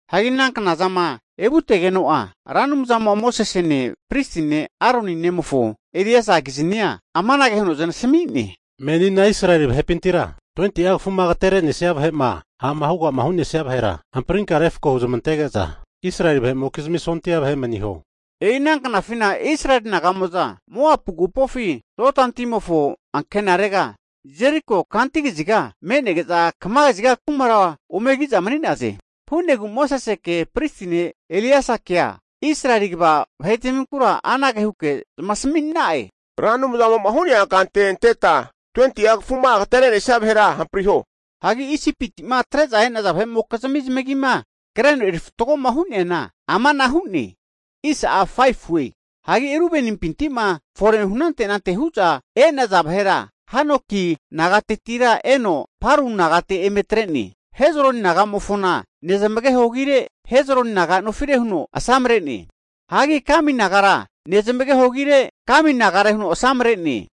Hagi ana knazama evutegeno'a Ra Anumzamo'a Mosesene pristi ne' Aroni nemofo Eleasakiznia amanage huno zanasami'ne, Menina Israeli vahepintira 20'a kafuma agaterenesia vahe'ma ha'ma huga hu'nesaza vahera hamprinka refako huzamantege'za Israeli vahe'mokizmi sondia vahe maniho. E'ina knafina Israeli naga'mo'za Moapu agupofi Jodani timofo ankenarega, Jeriko kantu kaziga me'nege'za kama kaziga kumara ome ki'za mani'naze. Hu'negu Moseseke Pristi ne' Elieasakea Israeli kva vahetaminkura anage huke zamasami'na'e, Ra Anumzamo'ma hu'nea kante anteta 20'a kafuma agatere'nesia vahera hampriho. Hagi Isipiti'ma atre'za e'naza vahe'mokizmi zamagima kreno eri fatgoma hu'neana ama'na hu'ne. Hagi Rubenimpinti'ma forehu anante anante hu'za e'naza vahera Hanoki nagatetira eno Palu nagate eme atre'ne. Hezroni naga'mofona nezmageho agire, Hezroni naga nofire huno asamre'ne. Hagi Kami nagara, nezmageho agire, Kami nagare huno asamre'ne.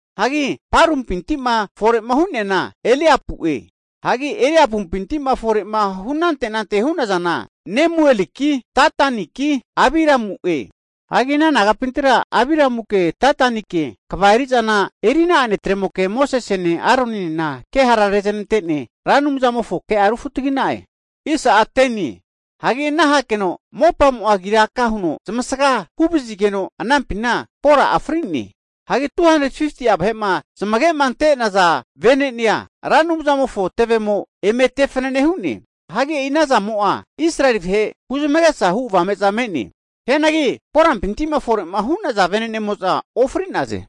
Hagi Palumpinti'ma fore hu'neana Eliapue. Hagi Eliapumpintima forehu anante anante hu'nazana Nemueliki, Dataniki, Abiramu'e. Hagi ana nagapintira Abiramuke Datanike kva eri'zana eri'na'a netremoke Mosesene Aroninena kehara rezanante'ne Ra Anumzamofo kea rufutagi'na'e. Hagi ana hakeno mopamo'a agira aka huno zamasaga huvazigeno, anampina Kora'a fri'ne. Hagi 250'a vahe'ma zamagema ante'naza vene'nea Ra Anumzamofo tevemo eme te fanane hu'ne. Hagi e'inazamo'a Israeli vahe huzmagesa hu avame'za me'ne. Hianagi Korampinti'ma fore hu'naza vene'nemo'za ofri'naze.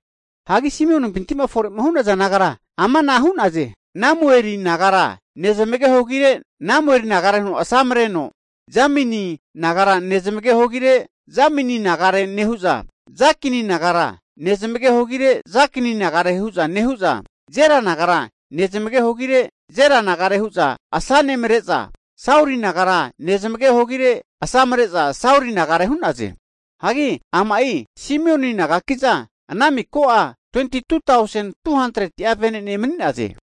Hagi Simionipinti'ma forehu naza nagara ama'na hu'naze, Nemueli nagara, nezmageho agire Nemueli nagare huno asanemreno, Jamini nagara nezmageho agire Jamini nagare nehu'za, Jakini nagara nezmageho agire Jakini nagare hu'za nehu'za, Zera nagara nezmageho agire Zera nagare hu'za asanemare'za, Sauli nagara nezmageho agire asamre'za Sauli nagare hu'naze. Hagi ama'i Simioni nagaki'za ana miko'a 22tausen 200'a venene mani'naze.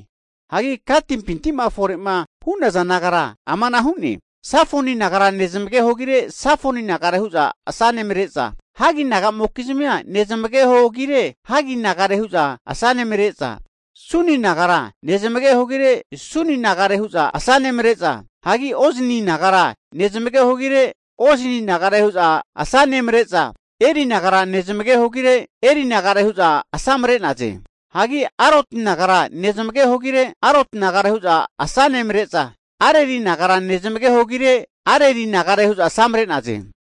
Hagi Gatipinti'ma fore hu'naza nagara ama'na hu'ne, Sefoni nagara nezmageho agire Sefoni nagare hu'za asanemare'za, Haggi nagamokizmia, nezmageho agire Haggi nagare hu'za asanemare'za, Suni nagara nezmageho agire, Suni nagare hu'za asanemare'za, hagi Ozni nagara nezmageho agire Ozni nagare hu'za asanemare'za, Eri nagara nezmageho agire, Eri nagare hu'za asamre'naze. Hagi Aroti nagara nezmageho agire, Aroti nagare hu'za asanemare'za, Areli nagara nezmageho agire, Areli nagare hu'za asamre'naze.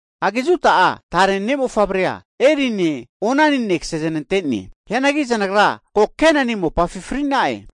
Hagi Juda'a tare mofavrea, Erine Onanine kasezanante'ne. Hianagi zanagra ko Kenani mopafi fri'na'e.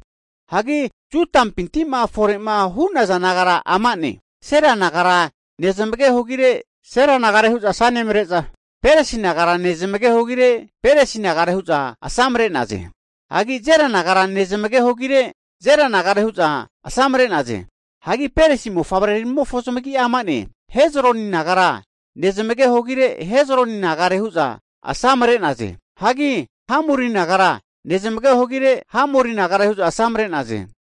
Hagi Judampinti'ma fore'ma hu'naza nagara ama'ne, Sela nagara nezmageho agire, Sela nagare hu'za asanemare'za, Peresi nagara nezmageho agire, Peresi nagare hu'za asamre'naze. Hagi Zera nagara nezmageho agire Zera nagare hu'za asamre'naze. Hagi Peresi mofavreramofo zamagi'a ama'ne, Hezroni nagara nezmageho agire, Hezroni nagare hu'za asamare'naze. Hagi Hamuli nagara nezmageho agire, Hamuli nagare hu'za asamre'naze.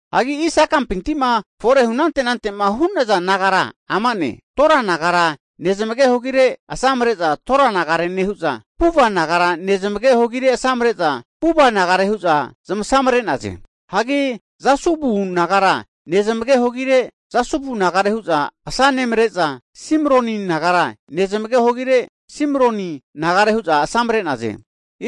Hagi Isakapinti'ma forehu anante anante'ma hu'naza nagara ama'ne, Tora nagara nezmageho agire asamre'za Tora nagare nehu'za, Puva nagare nezmageho agire asamre'za Puva nagare hu'za zamasamre'naze. Hagi Jasubu nagara nezmageho agire, Jasubu nagare hu'za asanemare'za, Simroni nagara nezmageho agire, Simroni nagare hu'za asamre'naze.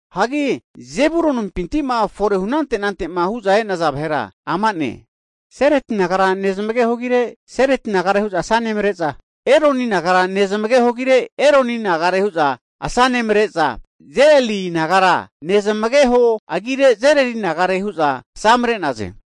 Hagi Zebulonimpiti'ma forehu anante anante'ma hu'za e'naza vahera ama'ne, Seredi nagara nezmageho agire Seredi nagare hu'za asanemare'za, Eloni nagara nezmageho agire Eloni nagare hu'za asanemare'za Jeleli nagara nezamageho agire Jeleli nagare hu'za zamasamre'naze.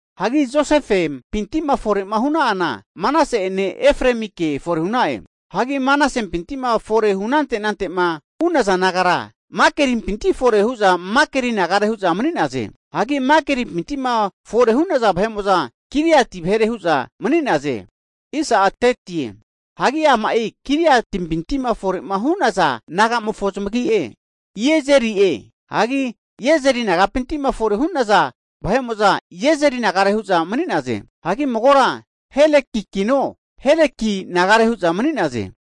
Hagi Josefempinti'ma fore hu'na'ana Manase'ene Efremike fore hu'na'e. Hagi Manasempinti'ma fore hu anante anante'ma hu'naza nagara Makirimpinti'ma fore hu'za Makiri nagare hu'za mani'naze. Hagi Makirimpinti'ma fore hu'naza vahe'mo'za, Giliati vahere hu'za mani'naze. Hagi ama'i Giliatimpinti'ma fore hu'nazana nagamofo zamagi'e, Iezeri'e, hagi Iezeri nagapinti'ma fore hu'naza vahe'mo'za Iezeri nagare hu'za mani'naze. Hagi magora Helekikino, Heleki nagare hu'za mani'naze.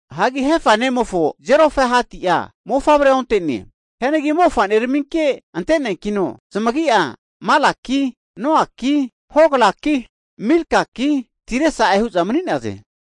Hagi Hefa nemofo Zelofehadi'a mofavrea onte'ne. Hianagi mofa'neraminke ante'neankino zamagi'a Malaki, Noaki, Hoglaki, Milkaki, Tirsae hu'za mani'naze.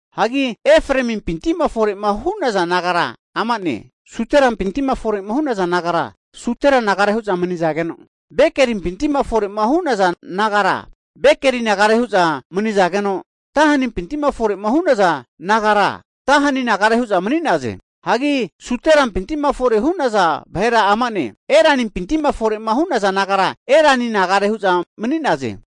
Hagi Efraemimpinti'ma fore'ma hu'naza nagara amane, Suterampinti'ma fore'ma hu'naza nagara, Sutera nagara hu'za manizageno, Bekelimpinti'ma fore hu'naza nagara, Bekeli nagare hu'za mani'zageno, Tahanimpinti'ma fore'ma hu'naza nagara, Tahani nagare hu'za mani'naze. Hagi Sutelampinti'ma fore hu'naza vahera ama'ne, Eranimpinti'ma fore hu'naza nagara, Erani nagare hu'za mani'naze.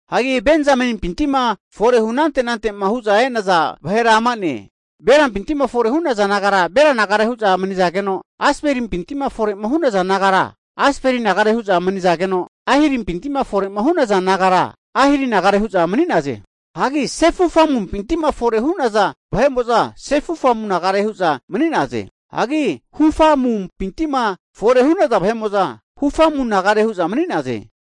Hagi Benzamenimpinti'ma fore hu anante anante'ma hu'za e'naza vahera ama'ne, Belampinti'ma fore hu'nazana nagara, Bela nagare hu'za manizageno, Asbelimpintima fore'ma hu'naza nagara, Asbeli nagare hu'za manizageno, Ahirimpinti'ma fore'ma hu'nazana nagara, Ahiri nagare hu'za mani'naze. Hagi Sefufamumpinti'ma fore hu'naza vahe'mo'za Sefufamu nagare hu'za mani'naze. Hagi Hufamumpinti'ma fore hu'naza vahe'mo'za, Hufamu nagare hu'za mani'naze.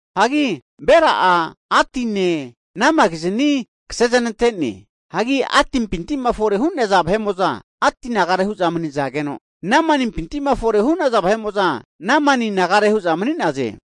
Hagi Bela'a Adine Namakizni kasezanante'ne. Hagi Adipinti'ma fore hu'naza vahe'mo'za, Adi nagare hu'za mani'zageno, Namanimpinti'ma fore hu'naza vahe'mo'za, Namani nagare hu'za mani'naze.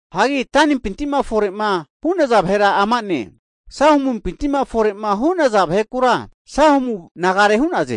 Hagi Danimpinti'ma fore'ma hu'naza vahera ama'ne, Suhamupinti'ma fore'ma hu'nazana vahekura, Suhamu nagare hu'naze.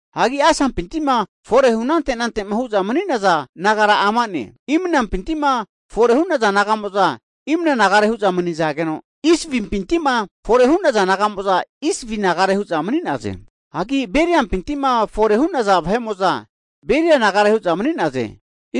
Hagi Asapinti'ma fore hu anante anante'ma hu'za mani'naza nagara ama'ne, Imnampinti'ma fore hu'naza naga'mo'za, Imna nagare hu'za manizageno, Isvimpintima fore hu'naza naga'mo'za, Isvi nagare hu'za mani'naze. Hagi Beriampinti'ma fore hu'naza vahe'mo'za, Beria nagare hu'za mani'naze.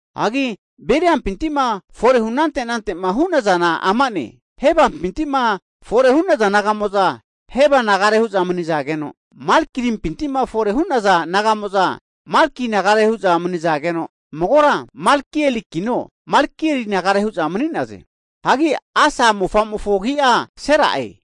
Hagi Beriampintima fore hu anante anante'ma hu'nazana ama'ne, Hebapinti'ma fore hu'naza naga'moza, Heba nagare hu'za mani'zageno, Malkimpinti'ma fore hu'naza naga'mo'za, Malki nagare hu'za mani'zageno, magora Malkielkino, Malkiel nagare hu'za mani'naze. Hagi Asa mofamofo agi'a Sera'e.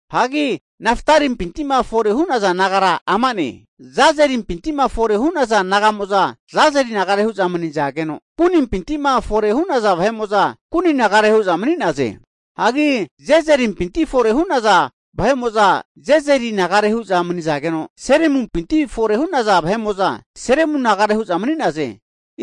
Hagi Naftarimpinti'ma fore hu'naza nagara ama'ne, Jazerimpinti forema hu'naza naga'mo'za Jazeri nagare hu'za manizageno, Gunimpinti'ma fore'ma haza vahe'mo'za Guni nagare hu'za mani'naze. Hagi Jezerepinti fore hu'naza vahe'mo'za, Jezeri nagare hu'za manizageno, Silemumpinti fore hu'naza vahe'mo'za, Silemu nagare hu'za mani'naze.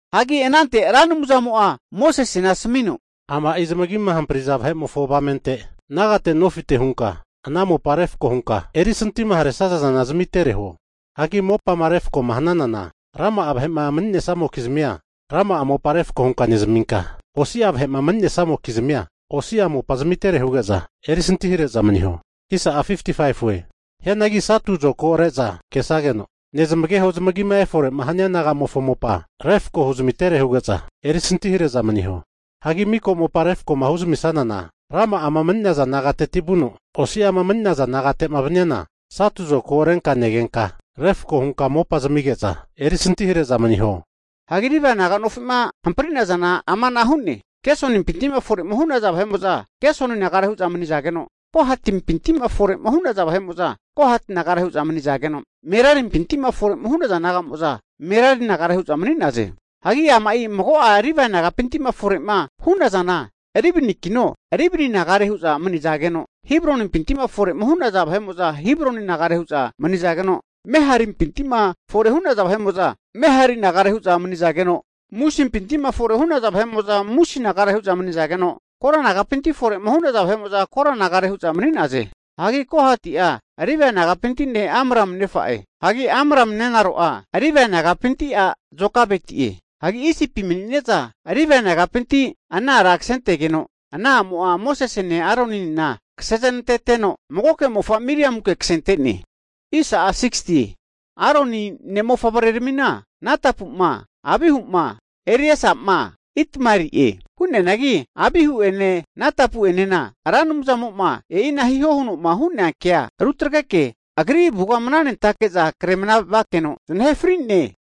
Hagi anante Ra Anumzamo'a Mosesena asamino, ama'i zamagima hampriza vahe'mofo avamente nagate nofite hunka ana mopa refako hunka erisintima haresazana zamitere huo. Hagi mopama refkoma hananana, rama'a vahe'ma mani'nesamokizmia rama'a mopa refko hunka nezaminka, osi'a vahe'ma mani'nesamokizmia osi'a mopa zamitere huge'za erisantihare'za maniho. Hianagi satu zokagore'za kesageno nezamageho zamagima efore'ma hania nagamofo mopa refko huzamitere huge'za erisantihare'za maniho. Hagi miko mopa refkoma huzamisanana rama'a mani'naza nagateti vuno, osi'ama mani'naza nagate'ma vaniana satu zokago renka negenka refako hunka mopa zamige'za erisantihare'za maniho. Hagi Levai naga nofi'ma hampri'nazana ama'na hu'ne, Gesonimpinti'ma fore'ma hu'naza vahe'mo'za Gesoni nagare hu'za mani'zageno, Kohatimpinti'ma fore hu'naza vahe'mo'za, Kohati nagare hu'za manizageno, Merarimpinti'ma fore hu'naza naga'mo'za Merari nagare hu'za mani'naze. Hagi ama'i mago'a Livae nagapinti'ma fore'ma hu'nazana, Libnikino, Libni nagare hu'za manizageno, Hebronimpinti'ma fore'ma hu'naza vahe'mo'za, Hebroni nagare hu'za mani'zageno, Maharimpinti'ma fore hu'naza vahe'mo'za Mahari nagare hu'za mani'zageno, Musimpinti'ma fore hu'naza vahe'mo'za Musi nagare hu'za manizageno, Kora nagapinti'ma fore'ma hu'naza vahe'mo'za Kora nagare hu'za mani'naze. Hagi Kohati'a Livae nagapinti ne' Amrami nefa'e. Hagi Amrami nenaro'a Livae nagapinti a' Jokabetie. Hagi Isipi mani'ne'za Livae nagapinti ana ara ksentegeno, ana a'mo'a Mosesene Aroninena kaseneznanteno, magoke mofa Miriamunke kasente'ne. Hagi Aroni ne' mofavreramina Natapu'ma, Abihu'ma, Ereasa'ma Itamarie. Hu'neanagi Abihu'ene Natapu'enena Ra Anumzamo'ma e'ina hiho huno'ma hu'nea ke'a rutagreke Agri avuga mnanentake'za kre mnavakeno zanahe fri'ne.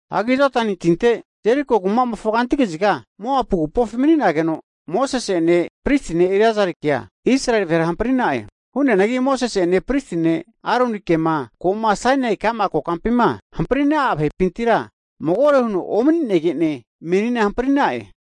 Hagi Jodani tinte Jeriko kumamofo kanti kaziga Moapu agupofi mani'nageno Mosese'ene pristi ne' Eleasarikea Israeli vahera hampri'na'e. Hu'neanagi Mosese'ene pristi ne' Aronikema ko'ma Sainai ka'ma kokampima hamprina'a vahepintira magore huno omani'negene, menina hampri'na'e.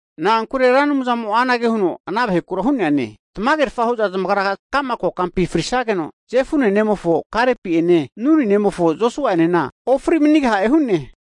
Na'ankure Ra Anumzamo'a anage huno ana vahekura hu'neane, tamagerfa hu'za zamagra kama kokampi frisageno, Jefuni ne'mofo Kalepi'ene Nuni nemofo Josua'enena ofri manigaha'e hu'ne.